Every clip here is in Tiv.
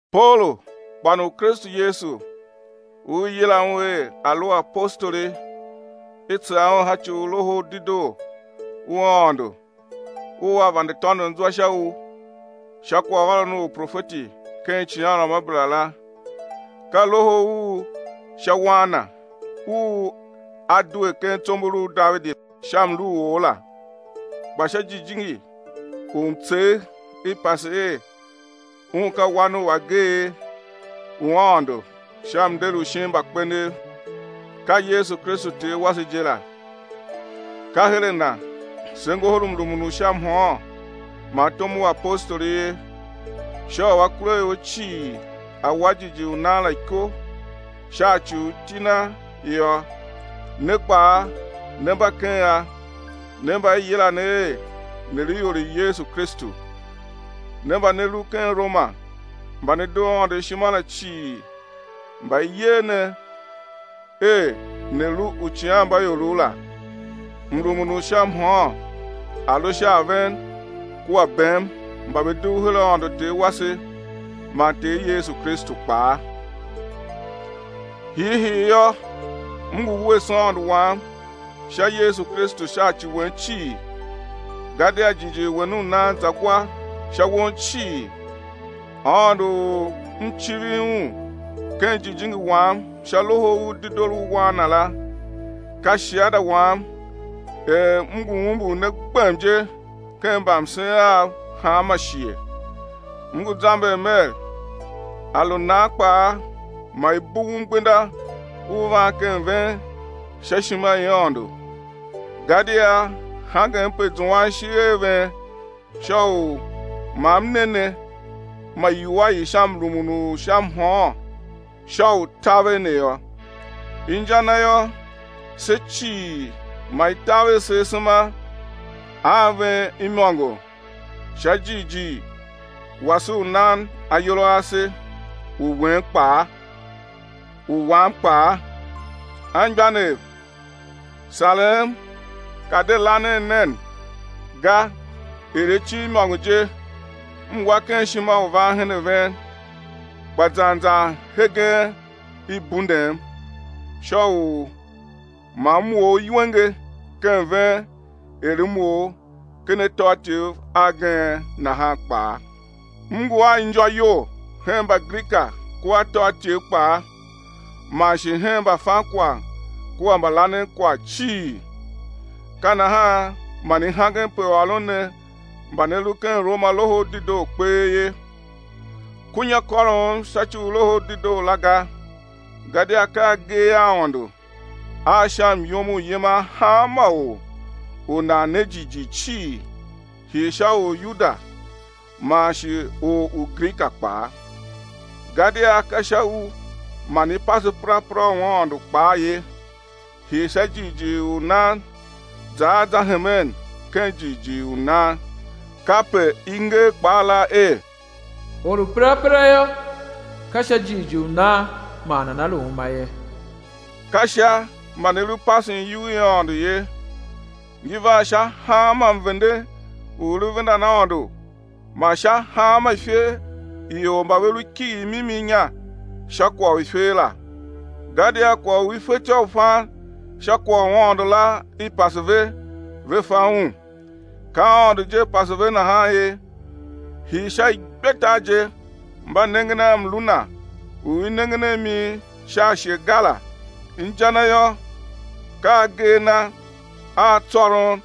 Paulu, kpan u Kristu Yesu u i yila un er a̱ lu apostoli, i tsegha un sha ci u Loho u Dedoo u Aôndo u A vande tôndon zwa sha u, sha kwaghôron u uprofeti ken icighanruamabera la; ka Loho u sha Wan Na u A due ken tsombor u Davidi sha mlu u or la, kpa sha Jijingi u mtsegh i pase er Un ka wan u ageegh u Aôndo sha mnder u shin mbakpenev, ka Yesu Kristu Ter wase je la. Ka hen a Na se ngohol mrumun u sha mhôôn man tom u apostoli ye, sha u akuraior cii a̱ wa jighjigh u nan la iko sha ci u iti Na yô. Ne kpaa, ne mba ken a, ne mba i yila ne er ne̱ lu ior i Yesu Kristu. Ne mba ne lu ken Roma mba ne doo Aôndo ishima la cii mba i yer ne er ne̱ lu uicighanmbaiorov la, mrumun u sha mhôôn a̱ lu sha a ven kua bem mba ve dugh her Aôndo Ter wase man Ter Yesu Kristu kpaa. Hiihii yô, m ngu wuese Aôndo wam sha Yesu Kristu sha ci wen cii, gadia jighjigh wen u nan za gwa sha won cii. Aôndo u m civir Un ken jijingi wam sha Loho u Dedoo u Wan Na la, ka shiada wam er m ngu umbur ne gbem je ken mbamsen av hanma shighe, m ngu zamber mer, a lu nan kpaa ma i bughum gbenda u van ken ven sha ishima i Aôndo. Gadia hangem pe zuan ishigh a ven sha u ma m ne ne ma iwua i sha mrumun u sha mhôôn sha u taver ne yô. Inja na yô, se cii ma i taver se asema a ven imôngo sha jighjigh wase u nan ayol a ase, u wen kpaa, u wam kpaa. Anmgbianev, sarem ka de lanen nen ga er acin imôngo je m wa ken ishima u van ken ven, kpa zan zan hegen i bundem, sha u ma m or iwenge ken ven er m or ken atôatyev agen nahan kpaa. M ngu a injô iyol hen Mbagrika kua atôatyev kpaa, man shi hen mbafankwagh kua mbalanenkwagh cii. Ka nahan man i hangem pe ôron ne mba ne lu ken Roma Loho u Dedoo kpee ye. Kunya kôrom sha ci u Loho u Dedoo la ga gadia ka agee a Aôndo a sha myom u yiman hanma or u nan ne jighjigh cii, hii sha or u Yuda man shi or u Grika kpaa. Gadia ka sha u man i pase perapera u Aôndo kpaa ye, hii sha jighjigh u nan za a za hemen ken jighjigh u nan. Kape i nger kpaa la er: Or u perapera yô, ka sha jighjigh u nan man nana lu uma ye. Ka Sha man i lu pasen iyugh i Aôndo ye. Ngi van sha hanma mvende u i lu vendan Aôndo man sha hanma ifer i ior mba ve lu kighir mimi inya sha kwagh u ifer la; gadia kwagh u i fetyô u fan sha kwagh u Aôndo la i pase ve, ve fa un. Ka Aôndo je pase ve nahan ye. Hii sha igbetar je mba nengen a mlu Na u i nengen a mi sha ashe ga la, inja na yô, ka agee a Na a tsôron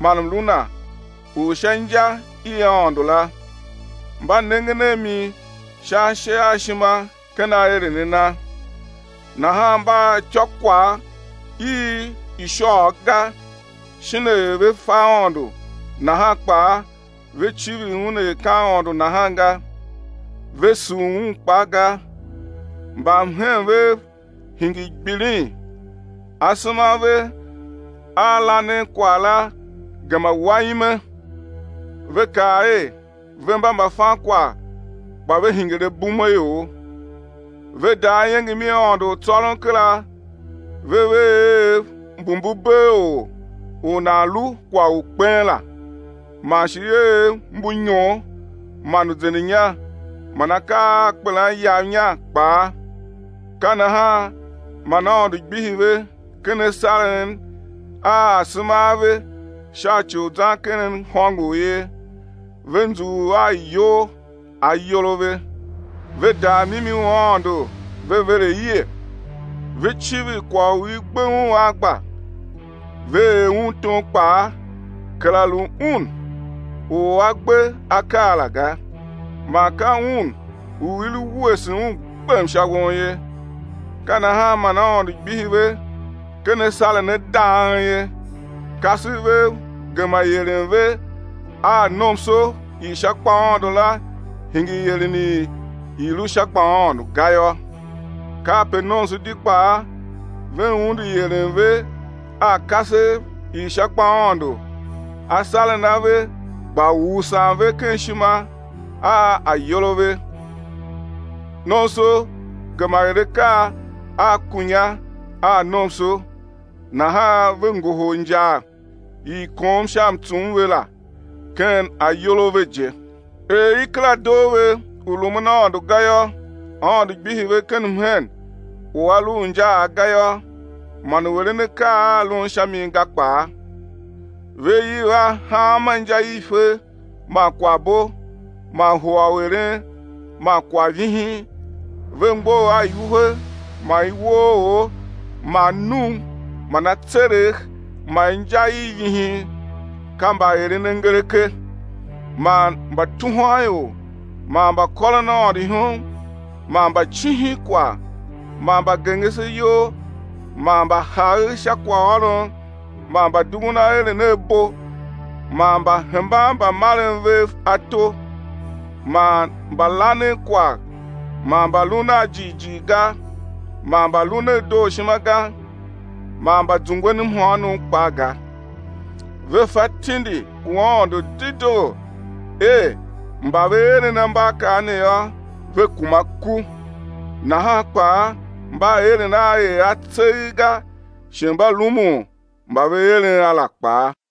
man mlu Na u sha inja i Aôndo la, mba nengen a mi sha ashe a ishima ken aeren a Na. Nahan mba a ityôkwagh i ishôôgh ga, shin er ve fe Aôndo nahan kpaa ve civir Un er ka Aôndo nahan ga, ve sugh Un kpaa ga, mbamhen vev hingir gbilin, asema a ve a lanen kwagh la gema wa ime. Ve kaa er, ve mba mbafankwagh kpa ve hingir abumeaior. Ve daa iengem i Aôndo u tsôron kera ve ver eev mbu mbu bee or u nan lu kwagh u kpen la, man shi eev mbu inyon man uzendenya man akaa a kpelan iyav inya kpaa. Ka nahan man Aôndo gbihi ve ken asaren a asema a ve sha ci u zan ken hôngor ye, ve nzughul a iyol, ayol a ve. Ve daa mimi u Aôndo ve ver aie. Ve civir kwagh u i gbe un a gba, ve er un tom kpaa, kera lu Un u A gbe akaa la ga, man ka Un u i lu wuese Un gbem sha won ye. Ka nahan man Aôndo gbihi ve ken asaren a dang ye, kasev vev gema ieren ve a nomso i sha gbaaôndo la hingir ieren i i lu sha gbaaôndo ga yô. Kape nomso di kpaa ve undu ieren ve a kasev i sha gbaaôndo, asaren a ve gba usan ve ken ishima a ayol a ve, nomso gema er akaa a kunya a nomso, nahan ve ngohol injar i i kom sha mtsum ve la ken ayol a ve je. Er i kera doo ve u rumun Aôndo ga yô, Aôndo gbihi ve ken mhen u a lu u injaagh ga yô, man u eren akaa a lun sha mi ga kpaa. Ve iv a hanma inja i ifer man kwaghbo man hua u eren man kwaghvihin, ve mgbough a iwuhe man iwooor, man num man atseregh man inja i vihin. Ka mbaerenangereke, man mbatuhwanior man mbakôron Aôndo ihom man mbacihinkwagh man mbagengeseyol man mbahagher sha kwaghôron man mbadughun aeren a bo man mbahemban mbamaren vev ato man mbalanenkwagh man mbalun a jighjigh ga, man mbalun a dooshima ga man mbazungwen mhôônom kpaa ga. Ve fa tindi u Aôndo dedoo er mba ve eren ambaakaa ne yô, ve kuma ku, nahan kpaa, mba eren a er a tseegh ga, shi mba rumun mba ve eren a la kpaa.